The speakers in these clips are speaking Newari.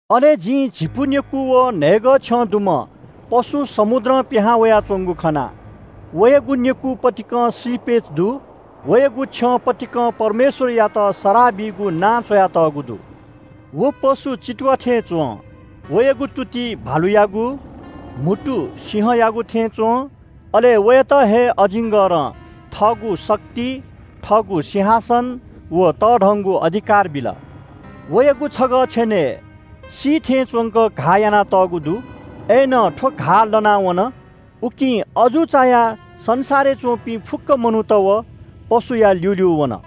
अले जिं झिपु नेकू व न्‍हय्‌गः छ्यं दुम्‍ह पशु समुद्रं पिहां वयाच्‍वंगु खना। वयागु नेकू पतिकं श्रीपेच दु। वयागु छ्यं पतिकं परमेश्‍वरयात सराः बीगु नां च्‍वयातःगु दु। व पशु चितुवा थें च्‍वं। वयागु तुति भालुयागु, म्‍हुतु सिंहयागु थें च्‍वं। अले वयात हे अजिङ्गरं थःगु शक्ति, थःगु सिंहासन व तःधंगु अधिकार बिल। वयागु छगः छेनय् सी थें च्‍वंक घाः यानातःगु दु। अय्‌नं थ्‍व घाः लना वन। उकिं अजू चायाः संसारय् च्‍वंपिं फुक्‍क मनूत व पशुया ल्‍यूल्‍यू वन।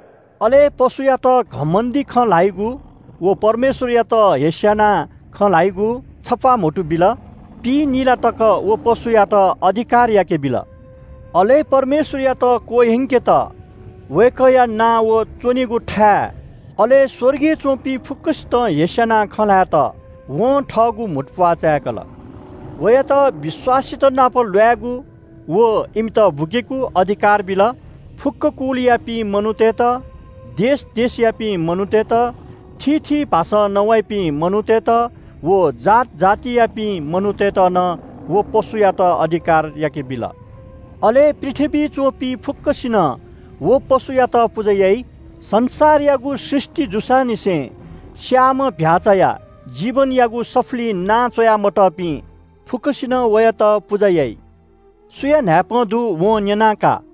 अले पशुयात घमण्‍डी खँ ल्‍हाइगु व परमेश्‍वरयात हेस्‍यानाः खँ ल्‍हाइगु छप्‍वाः म्‍हुतु बिल। पिइनिला तक व पशुयात अधिकार याकेबिल। अले परमेश्‍वरयात क्‍वह्यंकेत, वय्‌कःया नां व च्‍वनेगु थाय् अले स्‍वर्गय् च्‍वंपिं फुक्‍कसितं हेस्‍यानाः खँ ल्‍हायेत वं थःगु म्‍हुतुप्‍वाः चाय्‌कल। वयात विश्‍वासीतनाप ल्‍वायेगु व इमित बुकेगु अधिकार बिल। फुक्‍क कुलयापिं मनूतय्‌त, देश देशयापिं मनूतय्‌त, थीथी भाषां नवाइपिं मनूतय्‌त व जात जातियापिं मनूतय्‌त नं व पशुयात अधिकार याकेबिल। अले पृथ्‍वीइ च्‍वंपिं फुक्‍कसिनं व पशुयात पुजा याइ। संसारयागु सृष्‍टि जूसांनिसें स्‍याःम्‍ह चीधिकःम्‍ह भ्‍याःचाया जीवनयागु सफुलिइ नां च्‍वया मतःपिं फुक्‍कसिनं वयात पुजा याइ। सुया न्‍हाय्‌पं दु वं न्‍यना का।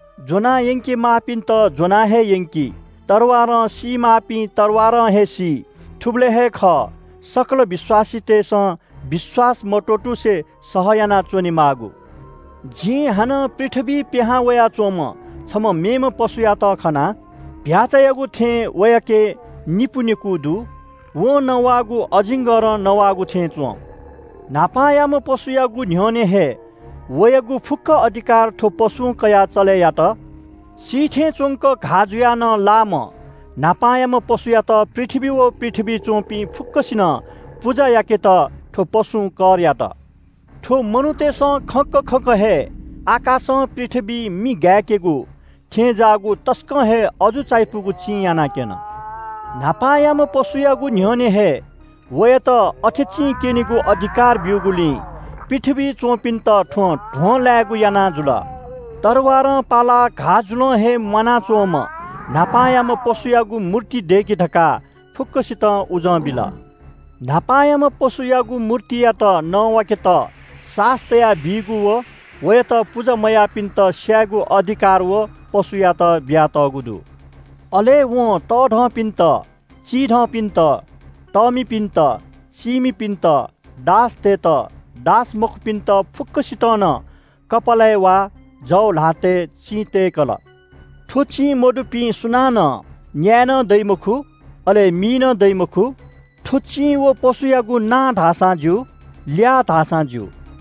ज्‍वना यंके माःपिन्‍त ज्‍वना हे यंकी। तरवारं सीमाःपिं तरवारं हे सी। थुबलय् हे खः सकल विश्‍वासीतय्‌सं विश्‍वास मत्‍वःतुसे सह यानाच्‍वनेमाःगु। जिं हानं पृथ्‍वीं पिहां वयाच्‍वंम्‍ह छम्‍ह मेम्‍ह पशुयात खना। चीधिकःम्‍ह भ्‍याःचायागु थें वयाके निपु नेकू दु। वं नवाःगु अजिङ्गरं नवाःगु थें च्‍वं। न्‍हापांयाम्‍ह पशुयागु न्‍ह्यःने हे वयागु फुक्‍क अधिकार थ्‍व पशुं कयाः चले यात। सी थें च्‍वंक घाः जुयाः नं लाःम्‍ह न्‍हापांयाम्‍ह पशुयात पृथ्‍वी व पृथ्‍वीइ च्‍वंपिं फुक्‍कसिनं पुजा याकेत थ्‍व पशुं कर यात। थ्‍व मनूतय्‌सं खंक खंक हे आकाशं पृथ्‍वीइ मि गाय्‌केगु थें ज्‍याःगु तसकं हे अजू चायापुगु चिं यानाक्‍यन। न्‍हापांयाम्‍ह पशुयागु न्‍ह्यःने हे वयात अथे चिं क्‍यनेगु अधिकार ब्‍यूगुलिं पृथ्‍वीइ च्‍वंपिन्‍त थ्‍वं ध्‍वंलायेगु याना जुल। तरवारं पालाः घाः जुलं हे म्‍वानाच्‍वंम्‍ह न्‍हापांयाम्‍ह पशुयागु मूर्ति दय्‌कि धकाः फुक्‍कसितं उजं बिल। न्‍हापांयाम्‍ह पशुयागु मूर्तियात नवाकेत सास तयाबीगु व वयात पुजा मयाःपिन्‍त स्‍यायेगु अधिकार व पशुयात बियातःगु दु। अले वं तःधंपिन्‍त, चिधंपिन्‍त, तःमिपिन्‍त, चीमिपिन्‍त, दासतय्‌त, दास मखुपिन्‍त फुक्‍कसितं नं कपालय् वा जव ल्‍हातय् चिं तय्‌कल। थ्‍व चिं मदुपिं सुनानं न्‍याये नं दइ मखु, अले मी नं दइ मखु। थ्‍व चिं व पशुयागु नां धाःसां ज्‍यू, ल्‍याः धाःसां ज्‍यू।